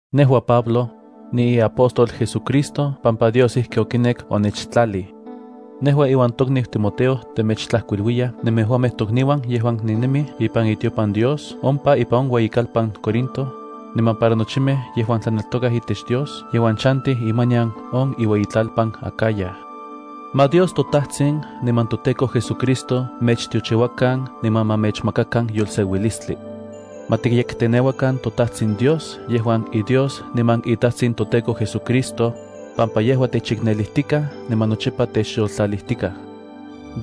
Nejua, Pablo, niiapóstol JesuCristo pampa Dios ijki okinek onechtlalij. Nejua iuan tokniu Timoteo temechtlajkuiluiyaj nemejuamej tokniuan yejuan nennemij ipan itiopan Dios ompa ipan on ueyikalpan Corinto, niman para nochimej yejuan tlaneltokakej itech Dios yejuan chantij imanian on iueyitlalpan Acaya. Ma Dios toTajtsin niman toTEKO JesuCristo mechtiochiuakan niman ma mechmakakan yolseuilistli. Ma tikyekteneuakan toTajtsin Dios yejuan iDios niman iTajtsin toTEKO JesuCristo, pampa yejua techiknelijtikaj niman nochipa techyoltlalijtikaj.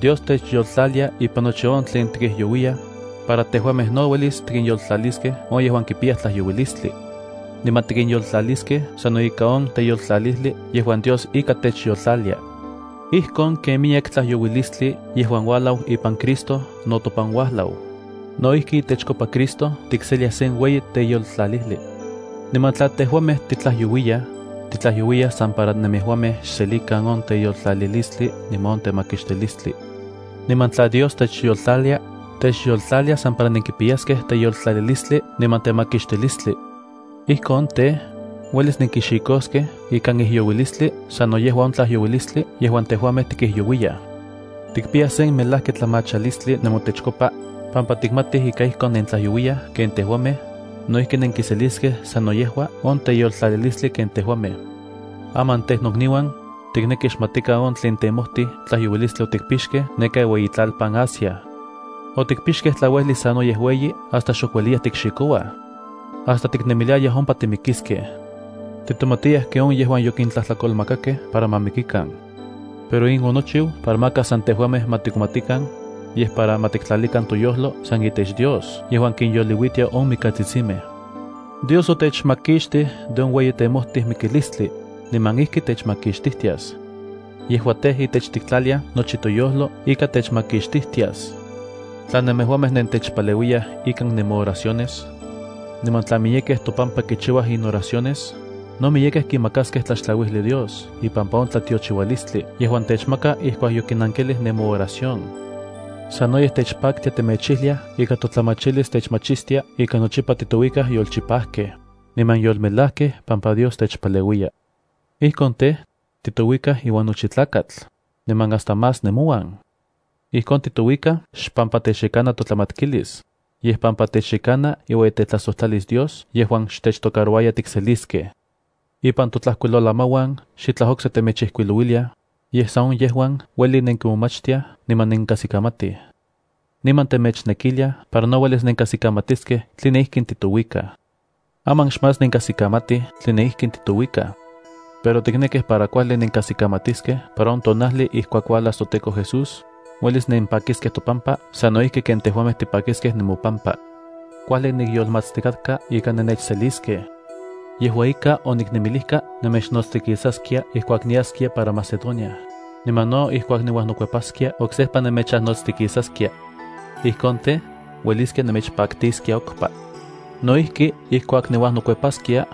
Dios techyoltlalia ipan nochi on tlen tikijyouiyaj, para tejuamej no uelis tikinyoltlaliskej on yejuan kipiyaj tlajyouilistli. Niman tikinyoltlaliskej sano ika on teyoltlalijli yejuan Dios ika techyoltlalia. Ijkon ken miyek tlajyouilistli yejuan uajlau ipan Cristo no topan uajlau, no ijki itechkopa Cristo tikseliaj sen ueyi teyoltlalijli. Niman tla tejuamej titlajyouiyaj, titlajyouiyaj san para nemejuamej xselikan on teyoltlalilistli niman on temakixtilistli. Niman tla Dios techyoltlalia, techyoltlalia san para nenkipiyaskej teyoltlalilistli niman temakixtilistli. Ijkon tej, uelis nenkixikoskej ikan ijyouilistli sano yejua on tlajyouilistli yejuan tejuamej tikijyouiyaj. Tikpiyaj sen melajki tlamachalistli nemotechkopa, pampa tikmatij ika ijkon ken nentlajyouiyaj ken tejuamej, no ijki nenkiseliskej sano yejua on teyoltlalilistli ken tejuamej. Aman tej nokniuan, tiknekij xmatikan on tlen temojtij tlajyouilistli otikpixkej neka iueyitlalpan Asia. Otikpixkej tlauejli sanoyej ueyi hasta xok ueliya tikxikouaj niman hasta tiknemiliayaj ompa timikiskej. Titomatiyaj ken on yejuan yokintlajtlakolmakakej para ma mikikan. Pero in onochiu para maka san tejuamej ma titonmatikan, yej para ma tiktlalikan toyojlo san itech Dios yejuan kinyoliuitia on mikatsitsimej. Dios otechmakixtij de on ueyi temojtij mikilistli, niman ijki techmakixtijtias. Yejua tej, itech tiktlaliaj nochi toyojlo ika techmakixtijtias, tla nemejuamej nentechpaleuiyaj ikan nemooraciones. Niman tla miyekej topampa kichiuaj inoraciones, no miyekej kimakaskej tlaxtlauijli Dios ipampa on tlatiochiualistli yejuan techmaka ijkuak yokinankilij nemooración. Sanoyej techpaktia temechijliaj ika totlamachilis techmachistia ika nochipa titouikaj yolchipajkej, niman yolmejlajkej pampa Dios techpaleuiya. Ijkon tej, titouikaj iuan nochi tlakatl, niman hasta más nemouan. Ijkon titouikaj xpampa techyekana totlamatkilis, yej pampa techyekana iueyitetlajsojtlalis Dios yejuan xtechtocarouaya tikseliskej. Ipan totlajkuilolamauan xitlaj okse temechijkuilouiliaj, yej san on yejuan ueli nenkimomachtiaj niman nenkajsikamatij. Niman temechnekiliaj para no uelis nenkajsikamatiskej tline ijkin titouikaj. Aman xmás nenkajsikamatij tline ijkin titouikaj. Pero tiknekij para kuajli nenkajsikamatiskej para on tonajli ijkuak uajlas toTEKO Jesús, uelis nenpakiskej topampa sano ijki ken tejuamej tipakiskej nemopampa. Kuajli nikyolmatstikatka ika nennechseliskej. Yejua ika, oniknemilijka nemechnotstikisaskia ijkuak niaskia para Macedonia, niman no ijkuak niuajnokuepaskia oksejpa nemechajnotstikisaskia. Ijkon tej, ueliskia nemechpaktiskia okpa. No ijki, ijkuak niuajnokuepaskia,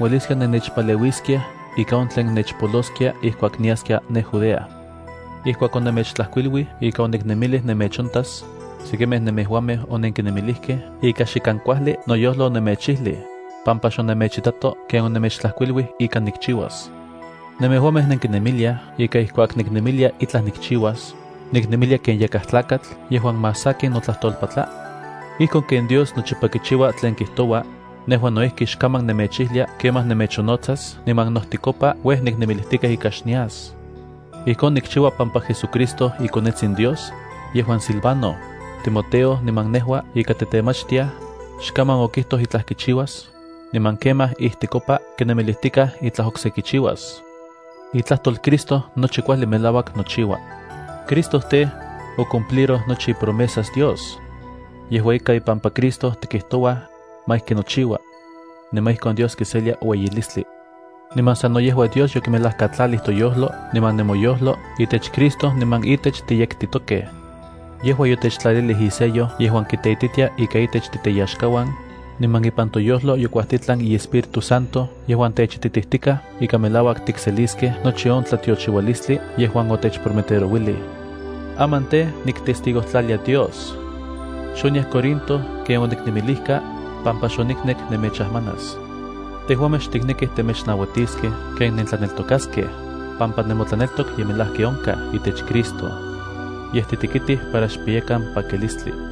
ueliskia nennechpaleuiskiaj ika on tlen nechpoloskia ijkuak niaskia ne Judea. Ijkuak onemechtlajkuiluij ika oniknemilij nemechontas, sekimej nemejuamej onenkinemilijkej ika xikan kuajli noyojlo onemechijlij, pampa xonemechitato ken onemechtlajkuiluij ika nikchiuas. ¿Nemejuamej nenkinemiliaj ika ijkuak niknemilia itlaj nikchiuas, niknemilia ken yakaj tlakatl yejuan más sakin notlajtolpatla? Ijkon ken Dios nochipa kichiua tlen kijtoua, nejua no ijki xkaman nemechijlia “kemaj nemechonnotsas” niman nojtikopa uej niknemilijtikaj ika xnias. Ijkon nikchiua pampa JesuCristo iKonetsin Dios, yejuan Silvano, Timoteo niman nejua ika titemachtiaj, xkaman okijtoj itlaj kichiuas, niman kemaj ijtikopa kinemilijtikaj itlaj okse kichiuas. Itlajtol Cristo nochi kuajli melauak nochiua. Cristo tej, ocumpliroj nochi ipromesas Dios. Yejua ika ipampa Cristo tikijtouaj: “Ma ijki nochiua.” Niman ijkon Dios kiselia ueyilistli. Niman sano yejua Dios yokimelajkatlalij toyojlo niman nemoyojlo itech Cristo niman itech tiyektitokej. Yejua yotechtlalilij isello yejuan kiteititia ika itech titeyaxkauan, niman ipan toyojlo yokuajtitlan iEspíritu Santo yejuan techititijtikaj ika melauak tikseliskej nochi on tlatiochiualistli yejuan otechprometerouilij. Aman tej, niktestigojtlalia Dios. Xoniaj Corinto ken oniknemilijka, pampa xoniknek nemechajmanas. Tejuamej xtiknekij temechnauatiskej ken nentlaneltokaskej, pampa nemotlaneltok ye melajki onkaj itech Cristo. Yej titekitij para xpiyakan pakilistli.